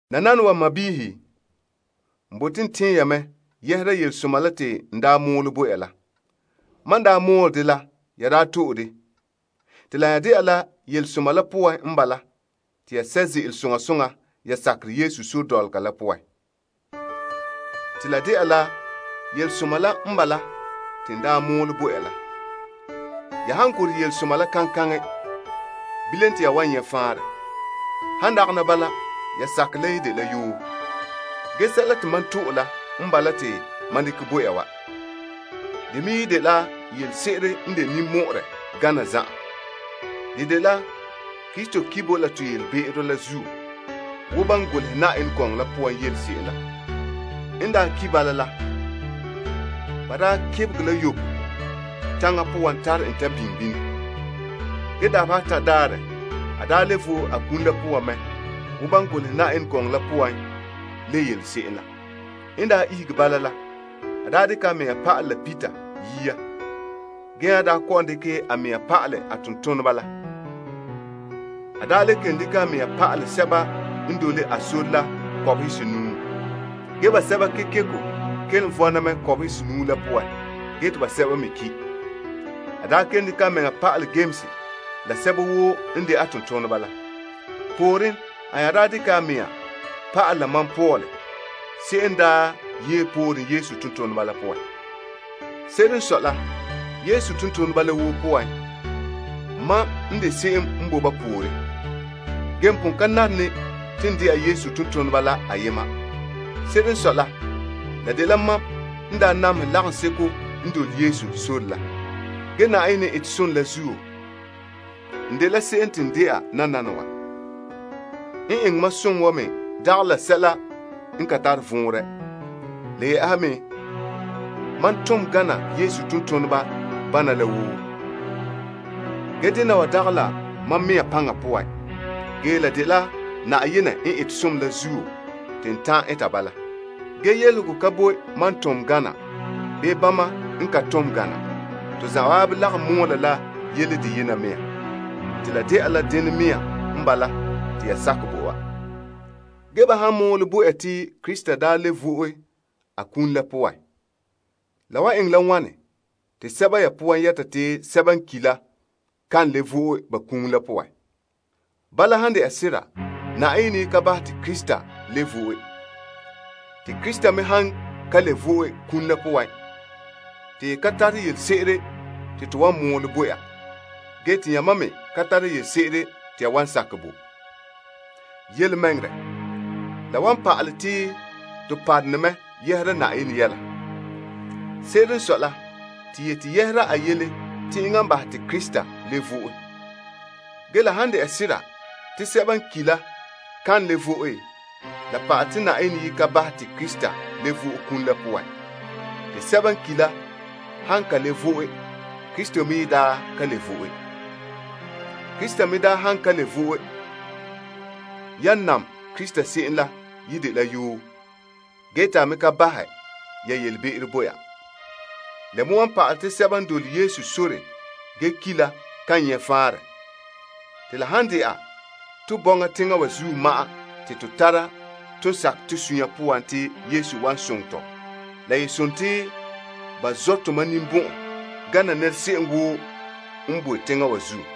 Nananawa n sɔɔnrɔ, n bote n tɛɛn ya mɛ yɛhera yelesoma la te n mɔɔlɛ bo ya la. Mam daa mɔɔlɛ dɛ la, ya daa to'e dɛ. Te la nya de'a la yelesoma la poan n bala te ya sɛ' ze'ele soŋa soŋa ya sakerɛ Yesu sore dɔlɔga la poan. Te la de'a la yelesoma la n bala te n daa mɔɔlɛ bo ya la. Ya han gorɛ yelesoma la kaŋkaŋɛ, bilam te ya wan nyɛ' faanrɛ. Han dagana bala, ya sakerɛ la ye dela yoo. Ge sɛla te mam to'e la n bala te mam me dekɛ bo ya wa. De me ye dela yelese'ere n de ninmɔ'ɔrɛ gana zan'an. De dela Krista ki' bo to la to yelebe'ero la zuo wo ban golehɛ Yenɛ gɔŋɔ la poan yele se'em la. N daa ki' bala la, ba daa kebegɛ la yoko taŋa poan tare en ta biŋe bini. Ge, dabeha atan' daarɛ, a daa le vo'e a kum la poan mɛ wo ban golehɛ Yenɛ gɔŋɔ la poan le yele se'em la. N daa ihege bala la, a daa dekɛ a mea pa'alɛ la Peter yia gee nya daa kɔ'ɔn dekɛ a mea pa'alɛ a tontoneba la. A daa le kelom dekɛ a mea pa'alɛ sɛba n dole a sore la kɔbehe senuu. Ge basɛba kekeko kelom vɔna mɛ kɔbehe senuu la poan gee te basɛba me ki'. A daa kelom dekɛ a mea pa'alɛ Yames la sɛba woo n de a tontoneba la. Pooren, a nya daa dekɛ a mea pa'alɛ la mam Paul se'em n daa ye pooren Yesu tontoneba la poan. Se'ere n sɔe la, Yesu tontoneba la woo poan mam n de se'em n bo ba pooren. N pon ka nare ne te n de'a Yesu tontoneba la ayema. Se'ere n sɔe la, la dela mam n daa namehɛ lagaŋseto n dole Yesu sore la. Ge, Na'ayenɛ n ete som la zuo, n dela se'em te n de'a nananawa. N eŋɛ mam som wa me dagɛ la sɛla n ka tare vɔnrɛ. Le yɛ'ɛha me, mam tom gana Yesu tontoneba bana la woo. Ge dena wa dagɛ la mam mea paŋa poan, ge la dela Na'ayenɛ n ete som la zuo te n ta'an eta bala. Ge yelehego ka bo mam tom gana bii bama n ka tom gana. To zanwaabe lagom mɔɔla la yele dena mea nɔɔ. Te la de'a la denɛ mea n bala te ya sakɛ bo wa. Ge ba han mɔɔlɛ bo ya te Krista daa le vo'e a kum la poan, la wan eŋɛ la wane te sɛba ya poan yɛta te sɛba n ki' la kan le vo'e ba kum la poan? Bala, han de'a sera Na'ayenɛ yi ka bahɛ te Krista le vo'e. Te Krista me han ka le vo'e a kum la poan, te yi ka tare yelese'ere te to wan mɔɔlɛ bo ya gee te yamam me ka tara yelese'ere te ya wan sakɛ bo. Yelemɛŋɛrɛ, la wan pa'alɛ te to parone mɛ yɛhera Na'ayenɛ yɛla. Se'ere n sɔe la, to yete yɛhera a yɛla te enŋa n bahɛ te Krista le vo'e. Ge, la han de'a sera te sɛba n ki' la kan le vo'e, la pa'alɛ te Na'ayenɛ yi ka bahɛ te Krista le vo'e a kum la poan. Te sɛba n ki' la han ka le vo'e, Krista me yi daa ka le vo'e. Krista me daa han ka le vo'e, yan naam Krista se'em la yi dela yoo gee te a me ka bahɛ ya yelebe'ero bo ya. La me wan pa'alɛ te sɛba n dole Yesu sore gee ki' la kan nyɛ' faanrɛ. Te la han de'a to bɔŋa teŋa wa zuo ma'an te to tara ton sakɛ to sunya poan te Yesu wan soŋɛ tɔ, la ye sontii ba zɔ' tomam ninbɔn'ɔn gana nɛra se'em woo n bo teŋa wa zuo.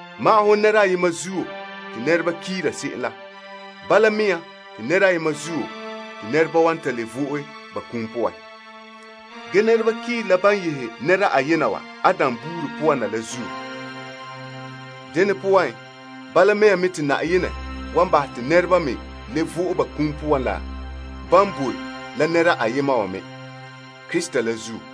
Magahɛ wo nɛra ayema zuo te nɛreba kiira se'em la, bala mea me nɔɔ te nɛra ayema zuo te nɛreba wan ta le vo'e ba kum poan. Ge nɛreba kiire la ban yehe nɛra ayema wa, Adam buuri poan na la zuo. Dene poan, bala mea me nɔɔ te Na'ayenɛ wan bahɛ te nɛreba me le vo'e ba kum poan la ban bo la nɛra ayema wa me, Krista la zuo.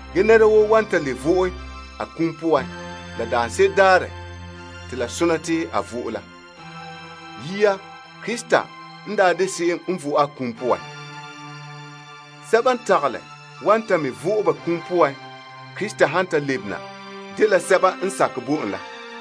Ge, nɛra woo wan ta le vo'e a kum poan la daanse'ere daarɛ te la sɔna te a vo'e la. Yia, Krista n daa de se'em n vo'e a kum poan. Sɛba n tagalɛ wan ta me vo'e ba kum poan Krista han ta lebena, dela sɛba n sakɛ bo en la.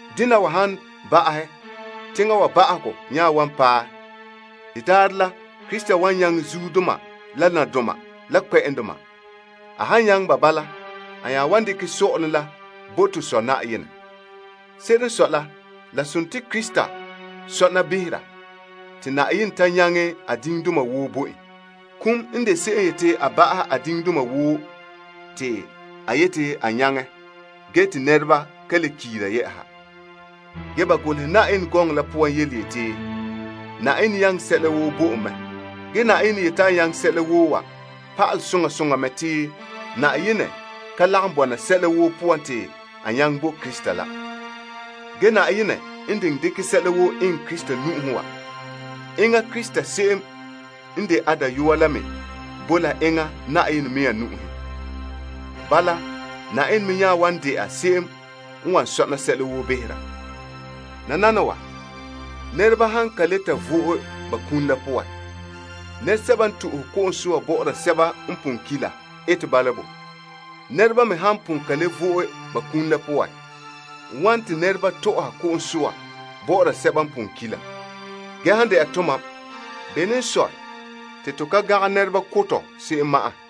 Dena wa han ba'ahɛ, teŋa wa ba'ahegɔ nya wan paɛ. De daarɛ la, Krista wan nyaŋɛ zuodoma la nadoma la kpɛ'ɛndoma. A han nyaŋɛ ba bala, a nya wan dekɛ sɔ'ɔlom la bo to Sɔ' Na'ayenɛ. Se'ere n sɔe la, la sontii Krista sɔna behera te Na'ayenɛ ta nyaŋɛ a diŋdoma woo bo en. Kum n de se'em n yete a ba'ahɛ a diŋdoma woo te a yete a nyaŋɛ gee te nɛreba ka le kiira yɛ'ɛha. Ge ba golehɛ Yenɛ gɔŋɔ la poan yeti, Na'ayenɛ nyaŋɛ sɛla woo bo en mɛ. Ge Na'ayenɛ n yete a nyaŋɛ sɛla woo wa pa'alɛ soŋa soŋa mɛ te Na'ayenɛ ka lagom bɔna sɛla woo poan te a nyaŋɛ bo Krista la. Ge, Na'ayenɛ n diŋɛ dekɛ sɛla woo eŋɛ Krista nu'uhen wa, enŋa Krista se'em n de a Dayɔa la me bo la enŋa Na'ayenɛ mea nu'uhen. Bala, Na'ayenɛ me nya wan de'a se'em n wan sɔna sɛla woo behera. Tɔ. Nananawa, nɛreba han ka ta le vo'e ba kum la poan, nɛresɛba n to'e ko'om soa bɔ'ɔra sɛba n pon ki' la bɔ'ɔra ba bo? Nɛreba me han pon ka le vo'e ba kum la poan, wane te nɛreba tɔ'ɔra ko'om soa bɔ'ɔra sɛba n pon ki' la? Ge han de'a tomam, bene n sɔe te to ka gangɛ nɛreba ko' tɔ se'em ma'an?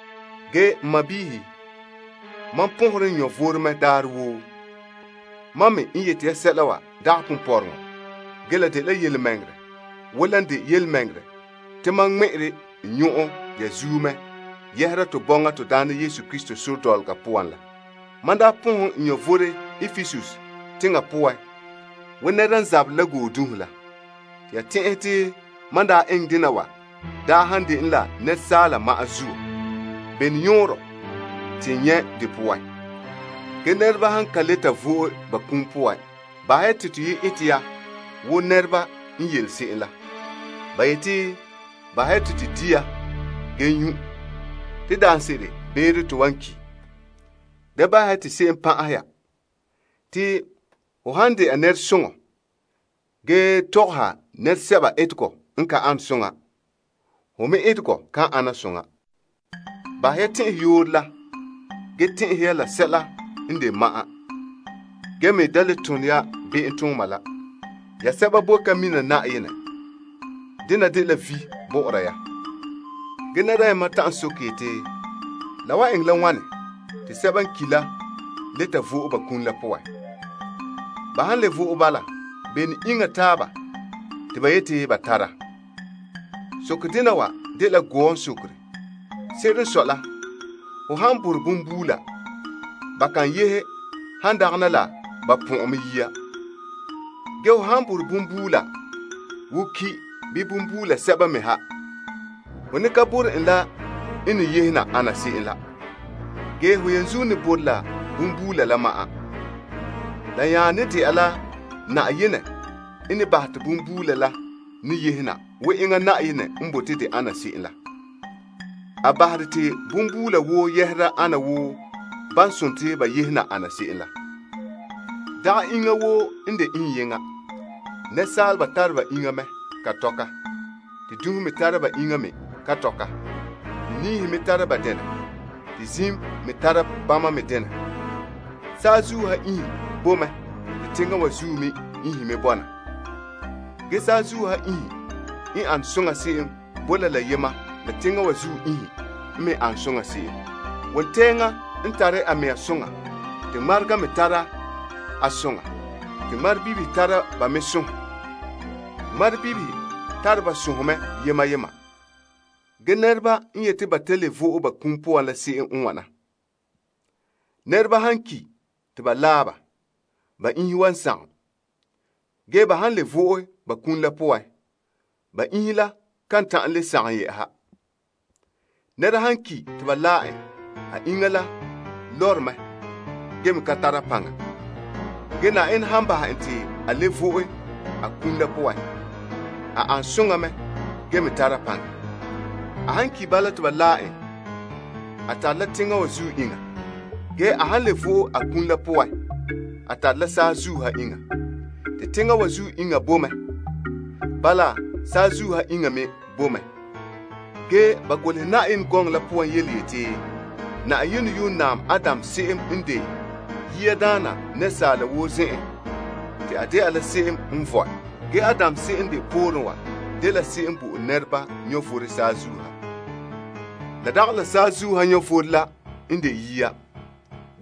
Ge n sɔɔnrɔ, mam pɔnhere n vom mɛ daarɛ woo. Mam me n yete ya sɛla wa dagɛ ponpɔrɔŋɔ. Ge, la dela yelemɛŋɛrɛ wo lan de yelemɛŋɛrɛ te mam ŋmɛ'ɛre n nyɔn'ɔn ya zuo mɛ yɛhera to bɔŋa to Daana Yesu Krista sore dɔlɔga poan la. Mam daa pɔnhɛ n vom Epesus teŋa poan wo nɛra n zabere la goodunhe la. Te ya tɛn'ɛhɛ te mam daa eŋɛ dena wa daa han dene la nɛresaala ma'an zuo, bene yɔɔrɔ te n nyɛ' de poan? Ge, nɛreba han ka ta le vo'e ba kum poan, bahɛ ya te toyi' eta ya wo nɛreba n yele se'em la. Ba yeti, Bahɛ ya te to di' gee nyu', beere wana ma'an te to ki' ya. Da bahɛ ya te se'em pan'ahɛ ya. Te ho han de'a nɛresoŋa gee tɔgɔha nɛresɛba etegɔ n ka an soŋa, hon me etegɔ kan ana soŋa. Bahɛ ya tɛn'ɛhɛ yooro la gee tɛn'ɛhe ya la sɛla n de ma'an gee me da le tone ya be'emtooma la. Ge ya sɛba boe ka mina Na'ayenɛ. Dena dela vi' bɔ'ɔra ya. Tɔ. Ge nɛra ayema ta'an soke yeti, La wan eŋɛ la wane te sɛba n ki' la le ta vo'e ba kum la poan? Ba han le vo'e bala, bene iŋa taaba te ba yete ba tara? Soke dena wa dela gɔɔn sokere. Se'ere n sɔe la, ho han borɛ bonbuula ba kan yehe han dagana la ba pɔn'ɛn mɛ yia. Ge ho han borɛ bonbuula wo ki' bii bonbuula sɛba me ha, ho ne ka borɛ en la n ne yehe ana se'em la. Ge, ho yenzuo ne borɛ la bonbuula la ma'an. La nya ne de'a la Na'ayenɛ n ne bahɛ te bonbuula la ne yehe na wo enŋa Na'ayenɛ n bote de ana se'em la. A bahere te bonbuula woo yɛhera ana wo ban sontii ba yehe na ana se'em la. Dagɛ iŋa woo n de iŋyeŋɔ. Nɛresaaleba tare ba iŋa mɛ ka tɔka, te dunhe me tara ba iŋa me ka tɔka, te niihe me tara ba denɛ, te ziim me tara bama me denɛ. Saazuo ha iinhe boe mɛ te teŋa wa zuo me iinhe me bɔna. Ge, saazuo ha iinhe n an soŋa se'em bo la la yema la teŋa wa zuo iinhe n me an soŋa se'em. Wontɛɛŋa n tare a mea soŋa, te ŋmarega me tara a soŋa te ŋmarebibihe tara ba me sɔnhe. Ge ŋmarebibihe tare ba sɔnhe me yema yema. Ge nɛreba n yete ba ta le vo'e ba kum poan la se'em n wana. Nɛreba han ki' te ba laɛ ba, ba iinhe wan sagom, ge ba han le vo'e ba kum la poan, ba iinhe la ka ta'an le sagom yɛ'ɛha. Nɛra han ki' te ba laɛ en, a iŋa la lɔre mɛ gee me ka tara paŋa, ge Na'ayenɛ han bahɛ en te a le vo'e a kum la poan, a an soŋa mɛ gee me tara paŋa. A han ki' bala te ba laɛ en, a tare la teŋa wa zuo iŋa. Ge, a han le vo'e a kum la poan, a tare la saazuo ha iŋa. Te teŋa wa zuo iŋa bo mɛ. Bala, saazuo ha iŋa me bo mɛ. Ge ba golehɛ Yenɛ gɔŋɔ la poan yeti, Na'ayenɛ yuun naam Adam se'em n de yiadaana te a ihege dɛna asaala. Ge Adam se'em n de pooren wa dela se'em n bo'ore nɛreba vom saazuo ha. La dagɛ la saazuo ha vom la n de yia,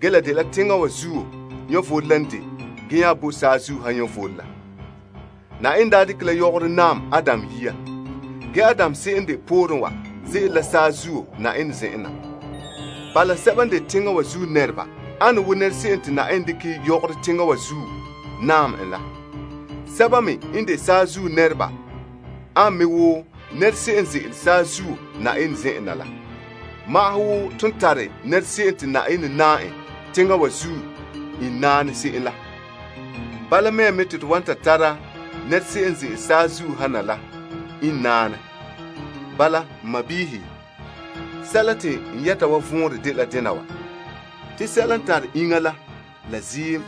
ge la dela teŋa wa zuo vom la n de gee nya bo saazuo ha vom la. Na'ayenɛ daa dekɛ la yɔgɔrɔ naam Adam yia. Ge, Adam se'em n de pooren wa ze'ele la saazuo Na'ayenɛ zen'en na. Bala, sɛba n de teŋa wa zuo nɛreba ane wo nɛra se'em te Na'ayenɛ dekɛ yɔgɔrɔ teŋa wa zuo naam en la. Sɛba me n de saazuo nɛreba an me wo nɛra se'em n ze'ele saazuo Na'ayenɛ zen'en na la. Magahɛ wo ton tare nɛra se'em te Na'ayenɛ naam en teŋa wa zuo iŋnaanɛ se'em la, bala mea me nɔɔ te to wan ta tara nɛra se'em n ze'ele saazuo ha na iŋnaanɛ. Bala n sɔɔnrɔ, sɛla te n yɛta wa vɔnrɛ dela dena wa. Te sɛla n tare iŋa la la ziim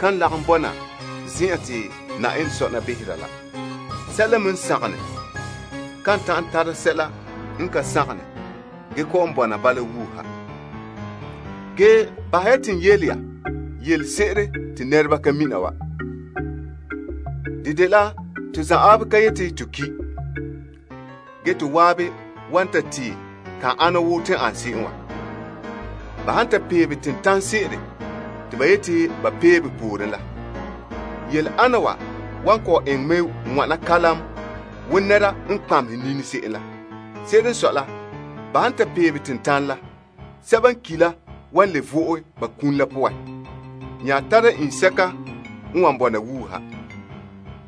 kan lagom bɔna zen'an te Na'ayenɛ sɔna behera la. Sɛla me n sagom ne kan ta'an tara sɛla n kan sagom ne gee kɔ'ɔn bɔna bala wuuha. Ge bahɛ ya te n yele ya yelese'ere te nɛreba ka mina wa. De dela to zanwaabe ka yete to ki'. Ge, to waabe wan ta tee kan ana wo ton an se'em wa. Ba han ta peebe tentanɛ se'ere te ba yeti ba peebe pooren la, yele ana wa wan kɔ'ɔn eŋɛ mɛ wana kalam wo nɛra n kpamehɛ nini se'em la. Se'ere n sɔe la, ba han ta peebe tentanɛ la, sɛba n ki' la wan le vo'e ba kum la poan nya tara iŋsɛka n wan bɔna wuuha.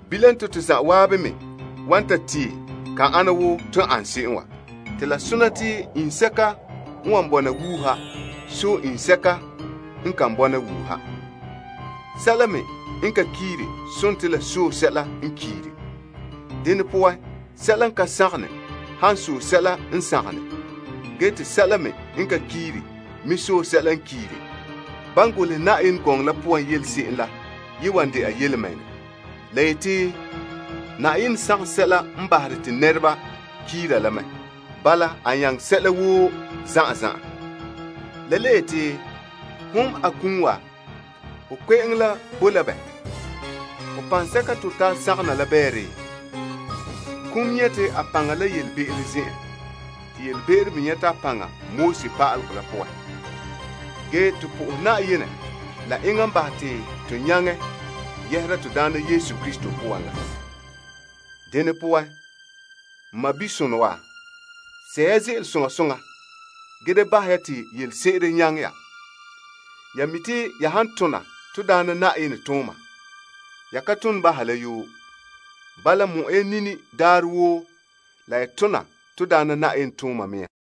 Bilam, te to zanwaabe me wan tee kan ana wo ton an se'em wa. Te la sontii iŋsɛka n wan bɔna wuuha sɔe iŋsɛka n kan bɔna wuuha. Sɛla me n ka kiire sontii la sɔe sɛla n kiire. Dene poan, sɛla n ka sagom ne han sɔe sɛla n sagom ne, gee te sɛla me n ka kiire me sɔe sɛla n kiire, ban golehɛ Yenɛ gɔŋɔ la poan yele se'em la ye wan de'a yelemɛŋɛrɛ. La yeti, Na'ayenɛ sagom sɛla n bahere te nɛreba kiira la mɛ. Bala, a nyaŋɛ sɛla woo zan'an zan'an. La le yeti, Hon akum wa, ho kpe'eŋo la bo la bɛ? Ho paŋsɛka te ho tara sagom na la bɛɛ? Kum nyɛte a paŋa la yelebe'ero zen'en te yelebe'ero me nyɛta a paŋa pa'alegɔ la poan. Ge, to po'ohɛ Na'ayenɛ la enŋa n bahɛ te to nyaŋɛ yɛhera to Daana Yesu Krista poan la. Dene poan, n mabisonɔ wa, sɛ' ya ze'ele soŋa soŋa gee da bahɛ ya te yelese'ere nyaŋɛ ya. Ya mi' te ya han tona to Daana Na'ayenɛ tooma, ya ka tone baha la yoo. Bala, mɔ'ɛ ya nini daarɛ woo la ya tona to Daana Na'ayenɛ tooma mea.